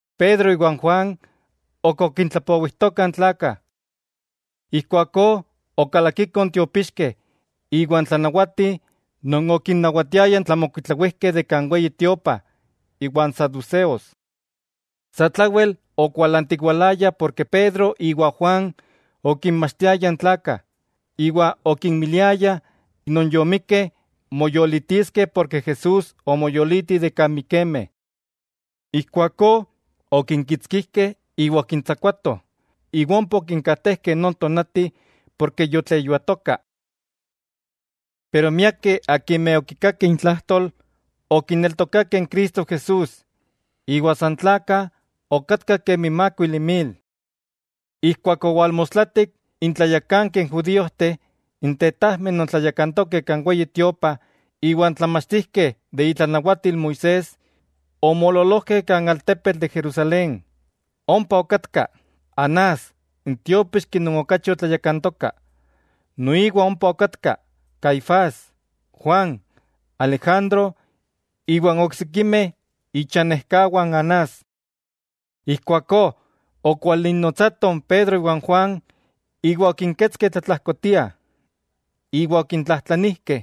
Pedro iwa n Juan ok okintlapowijtokah n tlakah. Ijkuakó okalakikoh n tiopixkeh iwa n tlanawati non okinnawatiaya n tlamokuitlawijkeh de kan Weyi Tiopa iwa n saduseos. Satlawel okualantiwalayah porke Pedro iwa Juan okinmachtiayah n tlakah, iwa okinmiliayah non yomikkeh moyolitiskeh porke Jesús omoyoliti de kan mikemeh. Ijkuakó okinkitskijkeh iwa okintsakuatoh, iwa ompa okinkajtejkeh non tonati porke yotleyuatoka. Pero miakeh akimeh okikakeh intlajtol, okineltokakeh Cristo Jesús; iwa san tlakah okatkah kemi mákuili mil. Ijkuak owalmostlatik, n tlayakankeh judíojteh, n tetajmeh non tlayakantokeh kan Weyi Tiopa iwa n tlamachtijkeh de itlanawatil Moisés, omoololojkeh kan altepetl de Jerusalén. Ompa okatka Anás n tiópixki non okachi otlayakantoka. Noiwa ompa okatka Caifás, Juan, Alejandro iwa n oksikimeh ichanejkawah n Anás. Ijkuakó okwalinnotsatoh n Pedro iwa n Juan iwa okinketskeh tlatlajkotia, iwa okintlajtlanijkeh: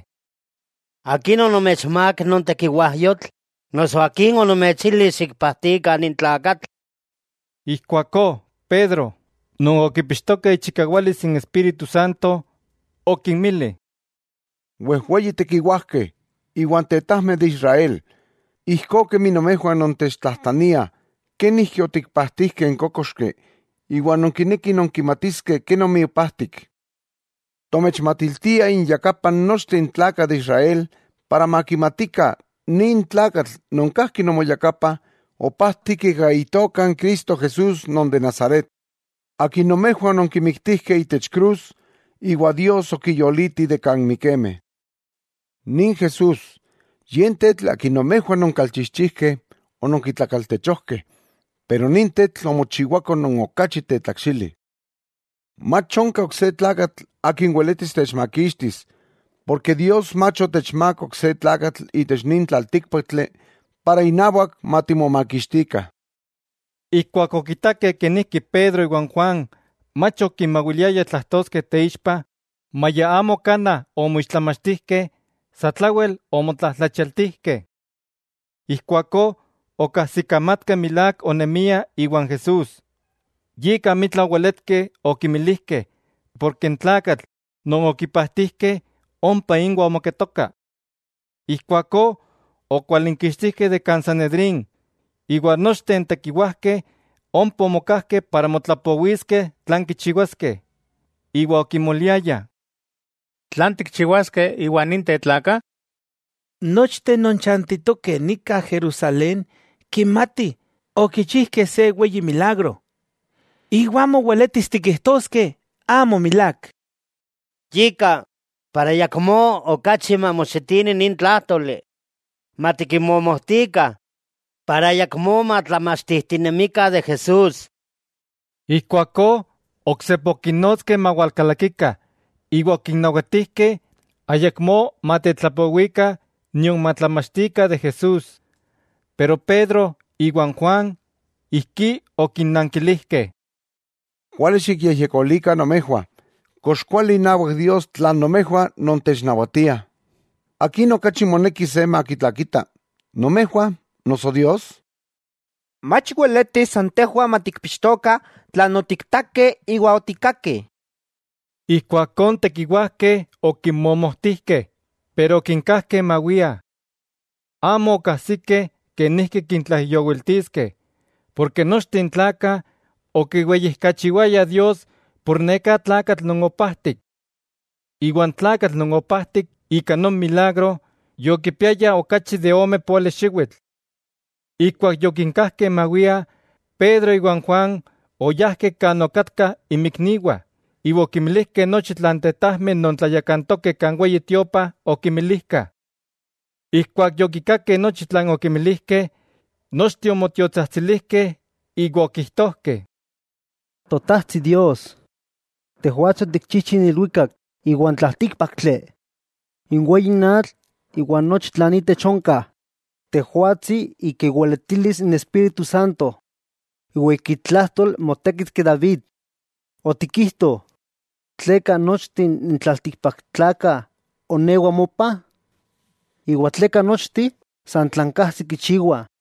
—¿Akin onomechmák non tekiwajyotl, noso akin onomechili xikpajtikah nin tlakatl? Ijkuakó Pedro, non okipixtoka ichikawalis n Espíritu Santo, okinmili: —Wejweyi tekiwajkeh iwa tetajmeh de Israel: Ijkó kemi nomejwah nontechtlajtlaniah, kenijki otikpajtijkeh n kókoxki, iwa nonkinekih nonkimatiskeh kenomi opajtik. Tomechmatiltiah inyakapah nochteh n tlakah de Israel para makimatikah nin tlakatl non kajki nomoyakapah, opajtik ika Itoka n Cristo Jesús non de Nazaret, Akin nomejwah ononkimiktijkeh itech krus, iwa Dios okiyoliti de kan mikemeh. Nin Jesús, Ye n tetl Akin nomejwah nonkalchijchijkeh ononkitlakaltechojkeh, pero nin tetl omochiwako non okachi tetlakxili. Mach onka ok se tlakatl akin weletis techmakixtis, porke Dios mach otechmák ok se tlakatl itech nin tlaltíkpaktli para inawak matimomakixtikah. Ijkuak okitakeh kenijki Pedro iwa n Juan mach okimawiliayah tlajtoskeh teixpa, maya amo kanaj omoixtlamachtijkeh, satlawel omotlajtlachialtijkeh. Ijkuakó okajsikamatkeh milák onemiah iwan Jesús. Yika amitla oweletkeh okimilijkeh porke n tlakatl non okipajtijkeh ompa inwah omoketoka. Ijkuakó okwalinkixtijkeh de kan Sanedrín, iwa nochteh n tekiwajkeh ompa omokajkeh para motlapowiskeh tlan kichiwaskeh. Iwa okimoliayah: —¿Tlan tikchiwaskeh iwa ninteh tlakah? Nochteh non chantitokeh nika Jerusalén kimatih okichijkeh se weyi milagro, iwa amo weletis tikijtoskeh amo milák. Yika, para ayakmó okachi mamoxitini nin tlájtoli, matikinmomojtikah, para ayakmó matlamachtijtinemikah de Jesús. Ijkuakó oksepa okinnotskeh mawalkalakikah iwa okinnawatijkeh ayakmó matetlapowikah nion matlamachtikah de Jesús. Pero Pedro iwa n Juan ijkí okinnankilijkeh: —Kuali xikyejyekolikah nomejwah, kox kuali inawak Dios tlan nomejwah nontechnawatiah, ¿akin okachi moneki se makitlakita, nomejwah noso Dios? Mach weletis san tejwah matikpixtokah tlan otiktakeh iwa otikkakeh. Ijkuakó n tekiwajkeh okinmomojtijkeh, pero okinkajkeh mawiah. Amo okajsikeh kenijki kintlaijyowiltiskeh, porke nochteh n tlakah okiweyijkachiwayah Dios por neká tlakatl non opajtik. Iwa n tlakatl non opajtik ika non milagro, yokipiaya okachi de ome póali xiwitl. Keman okinkajkeh mawiah, Pedro iwa n Juan oyajkeh kan okatkah inmikniwah, iwa okimilijkeh nochi tlan n tetajmeh non tlayakantokeh kan Weyi Tiopa okimilijkah. Ijkuak yokikakeh nochi tlan okimilijkeh, nochteh omotiotsajtsilijkeh iwa okijtojkeh: —Totajtsi Dios, Tejwatsi otikchijchi n ilwikak, iwa n tlaltíkpaktli, n weyi atl iwa nochi tlan intech onka. Tejwatsi ika iweletilis n Espíritu Santo iwa ika itlajtol motékitki David, otikijto: ¿Tleka nochteh n tlaltikpaktlakah onewah mopa? ¿Iwa tleka nochteh san tlan kajsih kichiwah?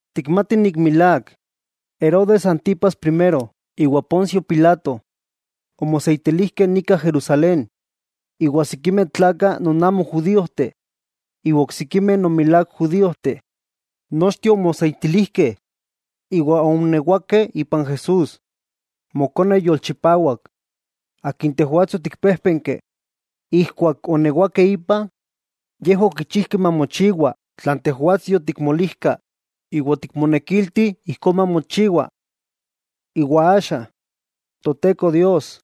'Tikmatih milák, Herodes Antipas Primero iwa Poncio Pilato omoseitilijkeh nika Jerusalén iwa sikimeh tlakah non amo judíojteh iwa oksikimeh non milák judíojteh, nochteh omoseitilijkeh iwa oonewakeh ipan Jesús Mokone yolchipawak, Akin Tejwatsi otikpéjpenki. Ijkuak oonewakeh ipa, yejwah okichijkeh mamochiwa tlan Tejwatsi yotikmolijka iwa otikmonekilti ijkó mamochiwa. Iwa axa, Toteko Dios,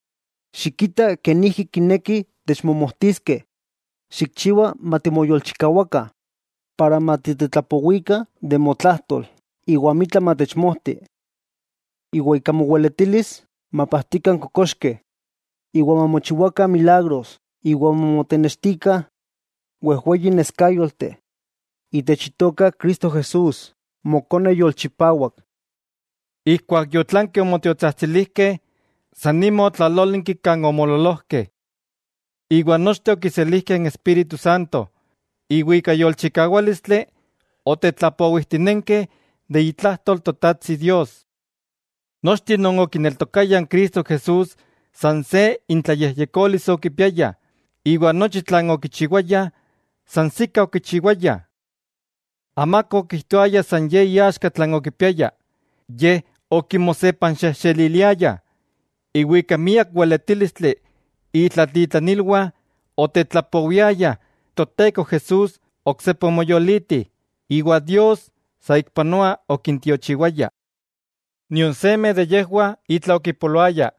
xikita kenijki kinekih techmomojtiskeh, xikchiwa matimoyolchikawakah para matitetlapowikah de motlajtol iwa amitla matechmojti. Iwa ika moweletilis mapajtikah n kokoxkeh, iwa mamochiwakah milagros iwa mamonextikah wejweyi neskayolteh itech Itoka Cristo Jesús Mokone yolchipawak. Ijkuak yotlankeh omotiotsajtsilijkeh, san nima otlalólinki kan omoololojkeh. Iwa nochteh okiselijkeh n Espíritu Santo, iwa ika yolchikawálistli otetlapowijtinenkeh de itlajtol Totajtsi Dios. Nochteh non okineltokayah n Cristo Jesús san se intlayejyekolis okipiayah, iwa nochi tlan okichiwayah, sansikah okichiwayah. Amaka okijtoaya san ye iaxka tlan okipiaya, yej okimosepanxejxeliliayah. Iwa ika miak weletílistli, itlatitlanilwah otetlapowiayah Toteko Jesús oksepa omoyoliti, iwa Dios saikpanoa okintiochiwaya. Nion seme de yejwah itla okipoloaya,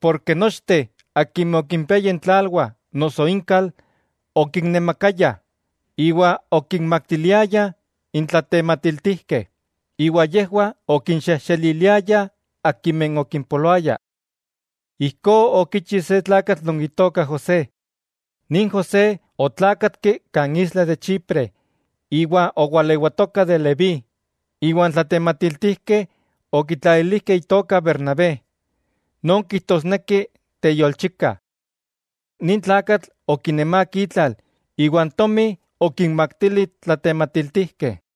porke nochteh akimeh okimpiayah intlalwah noso inkal, okinnemakayah, iwa okinmaktiliayah n tlatematiltijkeh, iwa yejwah okinxejxeliliayah akimeh okimpoloaya. Ijkó okichi se tlakatl non itoka José. Nin José otlákatki kan isla de Chipre iwa owalewatoka de Leví; iwa n tlatematiltijkeh okitlalilijkeh itoka Bernabé, non kijtosneki: Teyolchika. Nin tlakatl okinemák itlal iwa n tomi okinmaktili n tlatematiltijkeh.